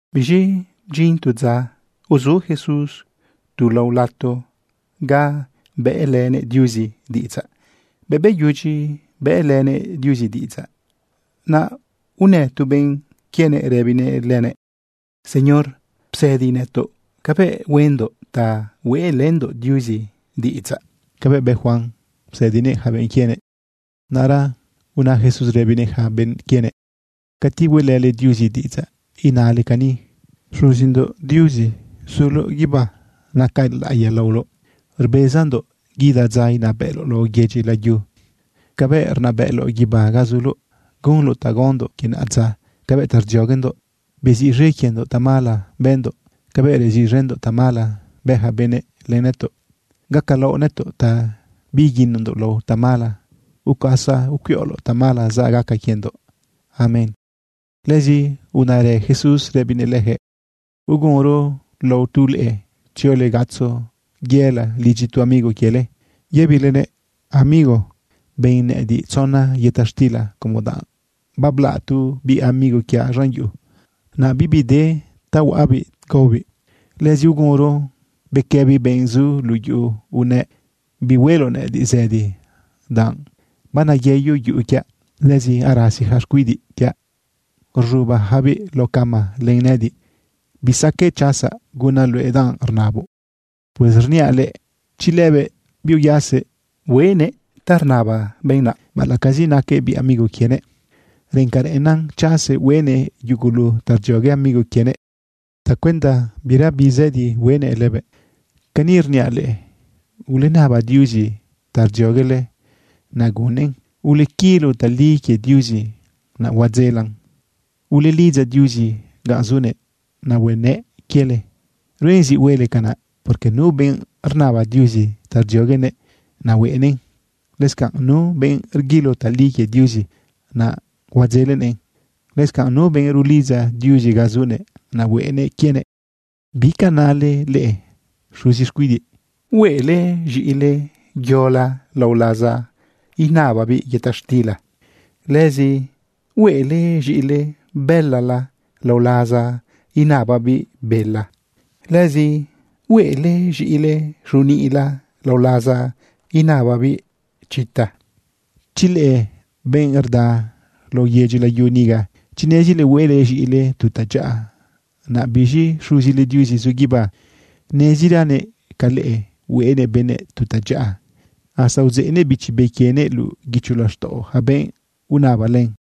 Biz̃i bdyin tu dza uzu Jesús tu lao lato ga bëꞌlënëꞌ Diuzi diꞌidzaꞌ. Bëꞌ beyudyi bëꞌlënëꞌ Diuzi diꞌidzaꞌ, naꞌ unë tu benꞌ quienëꞌ rëbinëꞌ lëbëꞌ: ―Señor, psëdi nëtoꞌ cabëꞌ huendoꞌ ta hueꞌlëndoꞌ Diuzi diꞌidzaꞌ cabëꞌ bë Juan psëdinëꞌ yaca benꞌ quienëꞌ. Naꞌra una Jesús rëbinëꞌ yaca benꞌ quienëꞌ: ―Cati hueꞌlële Diuzi diꞌidzaꞌ, inale cani: Xuzindoꞌ Diuzi zuloꞌ guibá, naca laꞌiya laoloꞌ. Rbezandoꞌ guida dza inabëꞌloꞌ lao yedyi layu cabëꞌ rnabëꞌloꞌ guibá ga zuloꞌ. Gunoꞌ ta gaondoꞌ quie naꞌadza cabëꞌ ta rdzioguendoꞌ. Beziꞌz̃e quiendoꞌ tamala bëndoꞌ cabëꞌ reziꞌz̃endoꞌ tamala bë yaca benëꞌ len nëtoꞌ. Gacalaoꞌ nëtoꞌ ta biiguinondoꞌ lao tamala, ucuasa ucuiꞌoloꞌtamala zaꞌ gaca quiendoꞌ. Amén. Lëzi unarë Jesús rëbinëꞌ leyaquëꞌ: ―Ugunro lao tu leꞌe tziole gatzo yela lidyi tu amigo quiele yëbilenëꞌ: “Amigo, ben nëꞌëdiꞌ tzona yëta xtila como danꞌ bablaꞌ tu biꞌ amigo quiaꞌ z̃an yuꞌu. Naꞌ bibi de ta huaꞌabiꞌ gaobiꞌ.” Lëzi ugunro bequëbi benꞌ zu luꞌu yuꞌu unëꞌ: “Bihueloꞌ nëꞌëdiꞌ zëdi, danꞌ baneyeyo yuꞌu quiaꞌ. Lëzi arasi yaca xcuidiꞌ quiaꞌ rz̃ubayacabiꞌ lao cama len nëꞌëdiꞌ. Bisaqueꞌ chasaꞌ gunaꞌ luëꞌ danꞌ rnaboꞌ.” Pues rniaꞌ leꞌe, chi lëbëꞌ biuyasëꞌ hueꞌnëꞌ ta rnaba benꞌ naꞌ, baꞌalaꞌcazi naquëꞌ biꞌ amigo quienëꞌ, reꞌen ca reꞌennan chasëꞌ hueꞌnëꞌ yugulu ta rdziogue amigo quienëꞌ tacuenda bira bizëdi huenëꞌ lëbëꞌ. Cani rniaꞌ leꞌe: Ulenaba Diuzi ta rdzioguele, naꞌ gunnëꞌn. Ulequilo tali quie Diuzi, naꞌ huadzelan. Ulelidza Diuzi ganꞌ zunëꞌ, naꞌ huenëꞌ quiele. Ruen zi huele canaꞌ, porque nu benꞌ rnaba Diuzi ta rdzioguenëꞌ, naꞌ hueꞌnëꞌn. Lëscanꞌ nu benꞌ rguilo tali quie Diuzi, naꞌ huadzelenëꞌn. Lëscanꞌ nu benꞌ rulidza Diuzi ganꞌ zunëꞌ, naꞌ huenëꞌ quienëꞌ. ’¿Bi ca nale leꞌe xuzi xcuidiꞌ? ¿Hueꞌle z̃iꞌile yola lao laza inababiꞌ yëta xtila? Lëzi, ¿hueꞌle z̃iꞌile bëlala lao laza inababiꞌ bela? Lëzi, ¿hueꞌle z̃iꞌile xuniꞌla lao laza inababiꞌ chita? Chi leꞌe, benꞌ rda lao yedyi layu niga, chi nezile hueꞌle z̃iꞌile tu tadyaꞌa, naꞌ biz̃i Xuzile Diuzi zu guibá, neziranëꞌ ca leꞌe hueꞌnëꞌ benëꞌ tu tadyaꞌa, hasta udzeꞌnëꞌ Bichi Be quienëꞌ luꞌu guicho laxtaꞌo yaca benꞌ unaba len.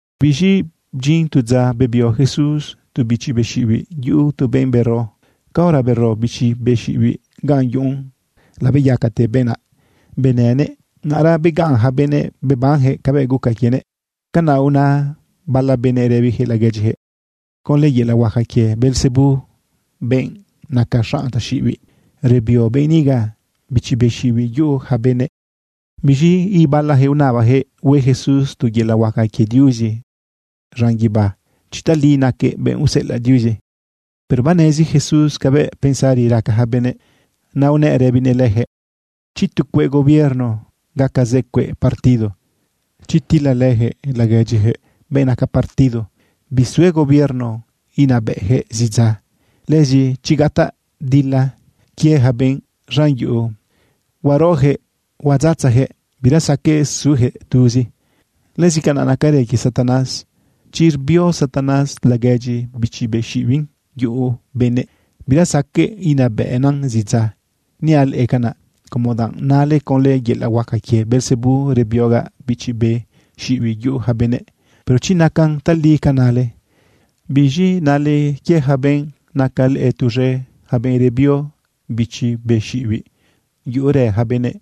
Biz̃i bdyin tu dza bebio Jesús tu bichi be xiꞌibiꞌ yuꞌu tu benꞌ bero. Caora bero bichi be xiꞌibiꞌ gan yuꞌun, labeyacate benꞌ naꞌ, benënëꞌ. Naꞌra begaꞌn yaca benëꞌ bebanyaquëꞌ cabëꞌ guca quienëꞌ. Canaꞌ una bala benëꞌ rëbiyaquëꞌ laguedyiyaquëꞌ: ―Conlë yelaꞌ huaca quie Beelzebú, benꞌ naca xanꞌ taxiꞌibiꞌ, rebio benꞌ niga bichi be xiꞌibiꞌ yuꞌu yaca benëꞌ. Biz̃i ibalayaquëꞌ unabayaquëꞌ hue Jesús tu yelaꞌ huaca quie Diuzi z̃an guibá chi tali naquëꞌ benꞌ useꞌelaꞌ Diuzi. Pero banezi Jesús cabëꞌ pensari raca yaca benëꞌ. Naꞌ unëꞌ rëbinëꞌ leyaquëꞌ: ―Chi tu cueꞌ gobierno gaca zë cueꞌ partido, chi tilalëyaquëꞌ laguedyiyaquëꞌ benꞌ naca partido, bisue gobierno inabëꞌyaquëꞌ zidza. Lëzi chi gataꞌ dila quie yaca benꞌ z̃an yuꞌu, huaroyaquëꞌ huadzatzayaquëꞌ, bira saqueꞌ suyaquëꞌ tuzi. Lëzi canaꞌ nacarë quie Satanás. Chi rbio Satanás laguedyi bichi be xiꞌibiꞌn yuꞌu benëꞌ, bira saqueꞌ inabëꞌnan zidza. Niaꞌ leꞌe canaꞌ, como danꞌ nale conlë yelaꞌ huaca quie Beelzebú rebiogaꞌ bichi be xiꞌibiꞌ yuꞌu yaca benëꞌ. Pero chi nacan tali ca nale, ¿biz̃i nale quie yaca benꞌ naca leꞌe tuz̃e, yaca benꞌ rebio bichi be xiꞌibiꞌ yuꞌurë yaca benëꞌ?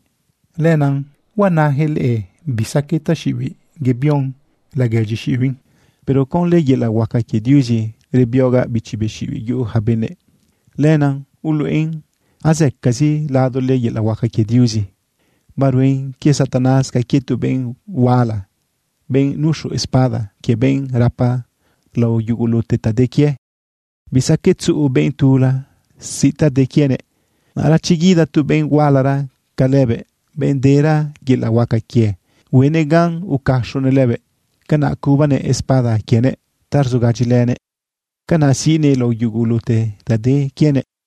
Lenaꞌ huanayaquëꞌ leꞌe bisaqueꞌ taxiꞌibiꞌ yebion laguedyi xiꞌibiꞌn. Pero conlë yelaꞌ huaca quie Diuzi rebiogaꞌ bichi be xiꞌibiꞌ yuꞌu yaca benëꞌ. Lenaꞌ uluꞌen azëcazi ladole yelaꞌ huaca quie Diuzi. ’Baruen quie Satanás ca quie tu benꞌ huala, benꞌ nuxu espada quie, benꞌ rapa lao yugulute ta de quie. Bisaqueꞌ tzuꞌu benꞌ tula siꞌ ta de quienëꞌ. Naꞌra chi guida tu benꞌ hualara ca lëbëꞌ, benꞌ dera yelaꞌ huaca quie, huenëꞌ gan ucaxonëꞌ lëbëꞌ. Canaꞌ cubanëꞌ espada quienëꞌ ta rzugadyilenëꞌ. Canaꞌ siꞌnëꞌ lao yugulute ta de quienëꞌ.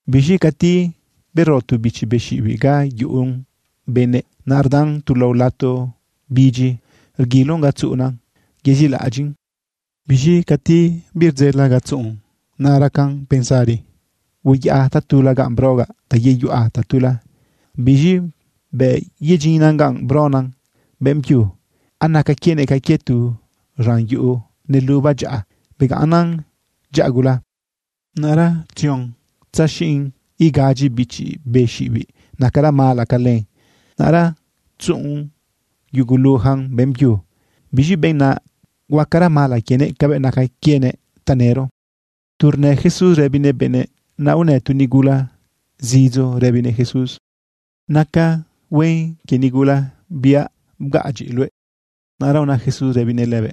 ―Biz̃i cati bero tu bichi be xiꞌibiꞌ ga yuꞌun benëꞌ, naꞌ rdan tu lao lato bidyi rguilon ga tzuꞌunan yezilaꞌadyiꞌn. Biz̃i cati birdzela ga tzuꞌun, naꞌ racan pensari: “Hueyaꞌa tatula ganꞌ brogaꞌ ta yeyuꞌa tatula.” Biz̃i bëꞌ yedyinnan ganꞌ brona beꞌmbyu, anaca quienëꞌ ca quie tu z̃an yuꞌu neluba dyaꞌa, begaꞌnnan dyaꞌa gula. Naꞌra tzion tzaxiꞌn igadyi bichi be xiꞌibiꞌ nacara mala ca len. Naꞌra tzuꞌu yuguluyacan beꞌmbyu. Biz̃i benꞌ naꞌ huacara mala quienëꞌ cabëꞌ naca quienëꞌ tanëro. Tu rnë Jesús rëbinëꞌ benëꞌ, naꞌ unë tu nigula zidzo rëbinëꞌ Jesús: ―Naca huen quie nigula biꞌa bgaꞌadyiꞌ luëꞌ. Naꞌra una Jesús rëbinëꞌ lëbëꞌ: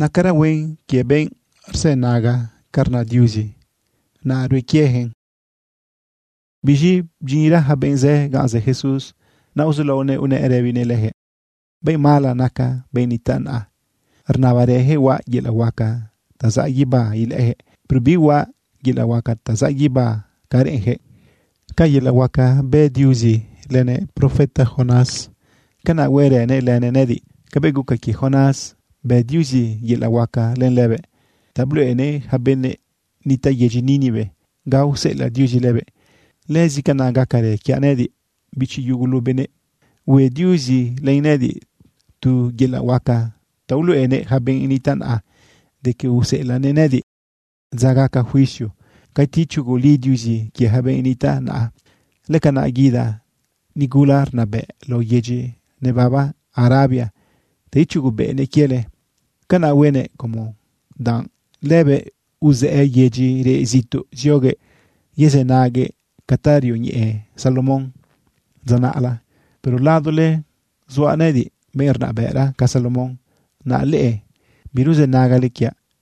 ―Nacara huen quie benꞌ re rzënaga ca rna Diuzi, naꞌ rue quieyaquëꞌn. Biz̃i bdyinra yaca benꞌ zë ganꞌ zë Jesús, naꞌ uzulaonëꞌ unëꞌ rëbinëꞌ leyaquëꞌ: ―Benꞌ mala naca benꞌ nitaꞌ naꞌa. Rnabarëyaquëꞌ huaꞌ yelaꞌ huaca ta zaꞌ guibá ilëꞌëyaquëꞌ. Pero bihuaꞌ yelaꞌ huaca ta zaꞌ guibá ca reꞌenyaquëꞌ. Ca yelaꞌ huaca bë Diuzi lënëꞌ profeta Jonás, canaꞌ huerënëꞌ lënëꞌ nëꞌëdiꞌ. Cabëꞌ guca quie Jonás, bë Diuzi yelaꞌ huaca len lëbëꞌ ta bluꞌenëꞌ yaca benꞌ nitaꞌ yedyi Nínive ga useꞌelaꞌ Diuzi lëbëꞌ, lëzi canaꞌ gacarë quiaꞌ nëꞌëdiꞌ, bichi yugulu benëꞌ. Hue Diuzi len nëꞌëdiꞌ tu yelaꞌ huaca ta uluꞌenëꞌ yaca benꞌ nitaꞌ naꞌa de que useꞌelaꞌnëꞌ nëꞌëdiꞌ. Dza gaca juicio cati ichuguli Diuzi quie yaca benꞌ nitaꞌ naꞌa, lëcanaꞌ guida nigula rnabëꞌ lao yedyi nebaba Arabia ta ichugubëꞌnëꞌ quiele. Canaꞌ huenëꞌ como danꞌ lëbëꞌ uzëꞌë yedyi reꞌ zituꞌ zioguëꞌ yezënaguëꞌ ca ta rioñeꞌe Salomón dza naꞌla. Pero ladole zuaꞌ nëꞌëdiꞌ, benꞌ rnabëꞌra ca Salomón, naꞌ leꞌe biruzënagale quiaꞌ.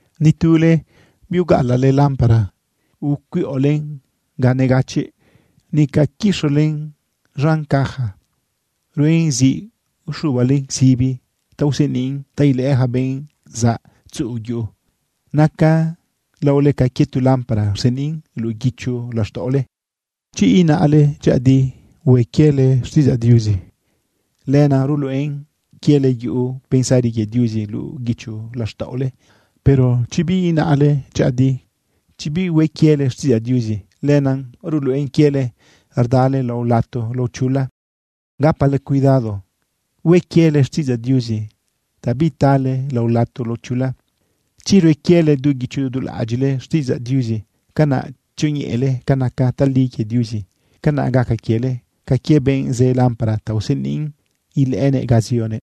―Ni tule biugaꞌalaꞌle lámpara ucuiꞌolen ga negachiꞌ, nica quixolen z̃an caja. Ruen zi ixubalen sibi ta useniꞌn ta ilëꞌë yaca benꞌ zaꞌ tzuꞌu yuꞌu. Naca laole ca quie tu lámpara rseniꞌn luꞌu guicho laxtaꞌole. Chi inaꞌle dyëꞌëdi hue quiele xtiꞌidzaꞌ Diuzi, lenaꞌ ruluꞌen quiele yuꞌu pensari quie Diuzi luꞌu guicho laxtaꞌole. Pero chi biinaꞌle dyëꞌëdi, chi bihue quiele xtiꞌidzaꞌ Diuzi, lenaꞌ ruluꞌen quiele rdale lao lato lao chula. Gapale cuidado hue quiele xtiꞌidzaꞌ Diuzi ta bitale lao lato lao chula. Chi rue quiele du guicho du laꞌadyiꞌle xtiꞌidzaꞌ Diuzi, canaꞌ tzioñeꞌele ca naca tali quie Diuzi, canaꞌ gaca quiele ca quie benꞌ zë lámpara ta useniꞌn ilëꞌënëꞌ ga zionëꞌ.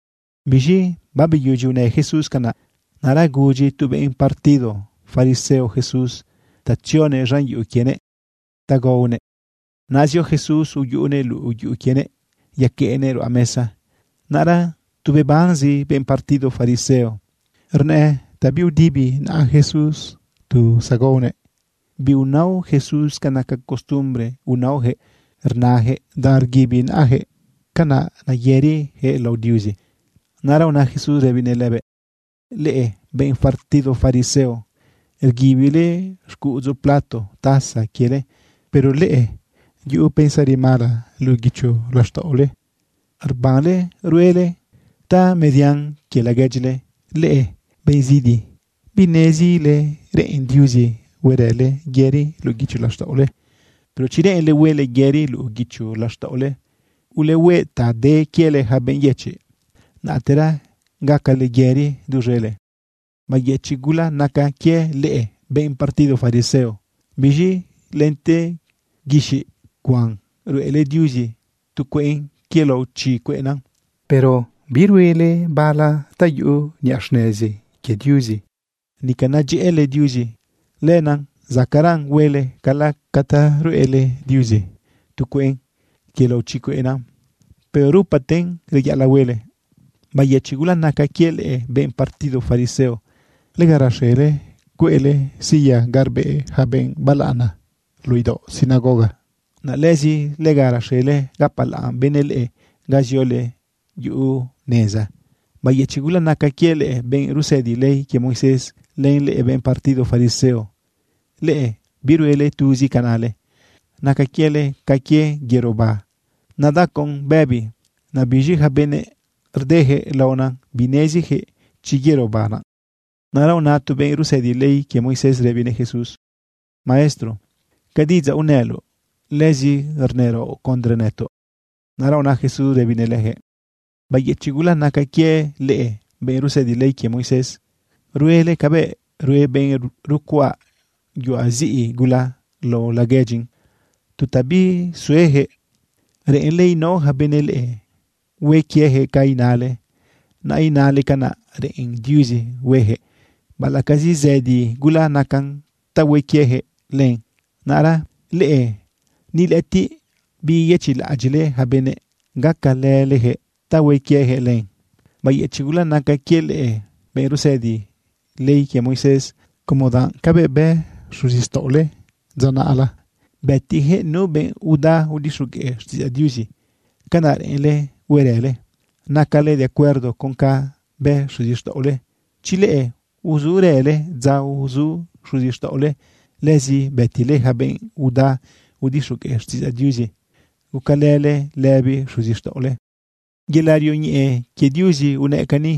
Biz̃i babeyudyi unë Jesús canaꞌ, naꞌra gudyi tu benꞌ partido fariseo Jesús ta tzionëꞌ z̃an yuꞌu quienëꞌ ta gaonëꞌ. Naꞌ zio Jesús uyuꞌunëꞌ luꞌu yuꞌu quienëꞌ yaqueꞌnëꞌ ruꞌa mesa. Naꞌra tu bebanzi benꞌ partido fariseo rnëꞌë ta biudibi naꞌa Jesús tu zagaonëꞌ. Biunao Jesús ca naca costumbre unaoyaquëꞌ rnayaquëꞌ danꞌ rguibi naꞌayaquëꞌ, canaꞌ neyëriyaquëꞌ lao Diuzi. Naꞌra una Jesús rëbinëꞌ lëbëꞌ: ―Leꞌe benꞌ partido fariseo, rguibile xcuꞌudzu plato taza quiele, pero leꞌe yuꞌu pensari mala luꞌu guicho laxtaꞌole, rbanle ruele tamedian quie laguedyile. ¡Leꞌe benꞌ zidi! ¿Binezile reꞌen Diuzi huerële yëri luꞌu guicho laxtaꞌole? Pero chi reꞌenle huele yëri luꞌu guicho laxtaꞌole, ulehueꞌ ta de quiele yaca benꞌ yëchiꞌ. Naꞌtera gacale yëri duz̃ele. ’¡Bayëchiꞌ gula naca quie leꞌe, benꞌ partido fariseo! Biz̃i lente guixiꞌ cuan ruꞌele Diuzi tu cueꞌn quie lao chi cueꞌna. Pero biruele bala ta yuꞌu niꞌa xnezi quie Diuzi, nica nedyëꞌële Diuzi. Lenaꞌ zacaꞌra huele, cala ca ta ruꞌele Diuzi tu cueꞌn quie lao chi cueꞌna, pero rupaten reyaꞌalaꞌ huele. ’¡Bayëchiꞌ gula naca quie leꞌe, benꞌ partido fariseo! Lega raxele cueꞌle silla ga rbeꞌ yaca benꞌ balaꞌana luꞌu idaoꞌ sinagoga. Naꞌ lëzi lega raxele gapalaꞌn benëꞌ leꞌe ga ziole yuꞌu neza. ’¡Bayëchiꞌ gula naca quie leꞌe, benꞌ rusëdi ley quie Moisés, len leꞌe, benꞌ partido fariseo! Leꞌe biruele tuzi ca nale. Naca quiele ca quie yerobá nadacon bëbi. Naꞌ biz̃i yaca benëꞌ rdeyaquëꞌ laonan bineziyaquëꞌ chi yerobá naꞌ. Naꞌra una tu benꞌ rusëdi ley quie Moisés rëbinëꞌ Jesús: ―Maestro, ca diꞌidzaꞌ unëloꞌ, lëzi rnëraoꞌ condre nëtoꞌ. Naꞌra una Jesús rëbinëꞌ leyaquëꞌ: ―¡Bayëchiꞌ gula naca quie leꞌe, benꞌ rusëdi ley quie Moisés! Ruele cabëꞌ rue benꞌ rucuaꞌ yuaꞌ ziꞌi gula lao laguedyin tu ta bisueyaquëꞌ. Reꞌenle inao yaca benëꞌ leꞌe, hue quieyaquëꞌ ca inale, naꞌ inale canaꞌ reꞌen Diuzi hueyaquëꞌ, baꞌalaꞌcazi zëdi gula nacan ta hue quieyaquëꞌ len. Naꞌra leꞌe ni lëꞌëtiꞌ biyeyëchiꞌlaꞌadyiꞌle yaca benëꞌ gacalële leyaquëꞌ ta hue quieyaquëꞌ len. ’¡Bayëchiꞌ gula naca quie leꞌe, benꞌ rusëdi ley quie Moisés! Como danꞌ cabëꞌ bë xuzixtaꞌole dza naꞌla bëtiyaquëꞌ nu benꞌ uda udixogueꞌ xtiꞌidzaꞌ Diuzi, canaꞌ reꞌenle huerële. Nacale de acuerdo con canꞌ bë xuzixtaꞌole. Chi leꞌe uzurële dza uzu xuzixtaꞌole, lëzi bëtile yaca benꞌ uda udixogueꞌ xtiꞌidzaꞌ Diuzi. Gucalële lëbizi xuzixtaꞌole. ’Yelaꞌ rioñeꞌe quie Diuzi unëꞌ cani: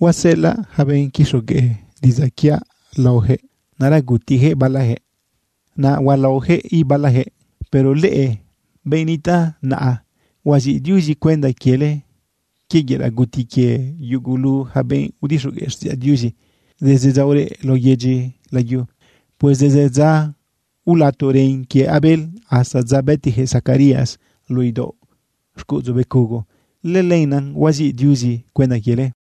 “Huaseꞌelaꞌ yaca benꞌ quixogueꞌ diꞌidzaꞌ quiaꞌ laoyaquëꞌ. Naꞌra gutiyaquëꞌ balayaquëꞌ, naꞌ hualaoyaquëꞌ ibalayaquëꞌ.” Pero leꞌe, benꞌ nitaꞌ naꞌa, huaziꞌ Diuzi cuenda quiele quie yelaꞌ guti quie yugulu yaca benꞌ udixogueꞌ xtiꞌidzaꞌ Diuzi, desde dza ureꞌ lao yedyi layu. Pues desde dza ulato ren quie Abel hasta dza bëtiyaquëꞌ Zacarías luꞌu idaoꞌ xcuꞌudzu becugo, lëlenaꞌ huaziꞌ Diuzi cuenda quiele.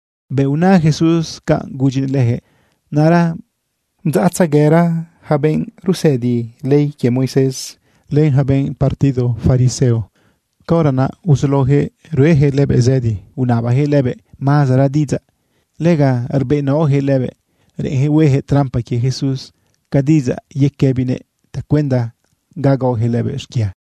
Bëꞌ una Jesús canꞌ gudyinëꞌ leyaquëꞌ, naꞌra bdzaꞌtzeguera yaca benꞌ rusëdi ley quie Moisés, len yaca benꞌ partido fariseo. Caora naꞌ uzulaoyaquëꞌ rueyaquëꞌ lëbëꞌ zëdi unabayaquëꞌ lëbëꞌ mazara diꞌidzaꞌ. Lega rbeꞌnaoyaquëꞌ lëbëꞌ reꞌenyaquëꞌ hueyaquëꞌ trampa quie Jesús ca diꞌidzaꞌ yequëbinëꞌ tacuenda ga gaoyaquëꞌ lëbëꞌ xquia.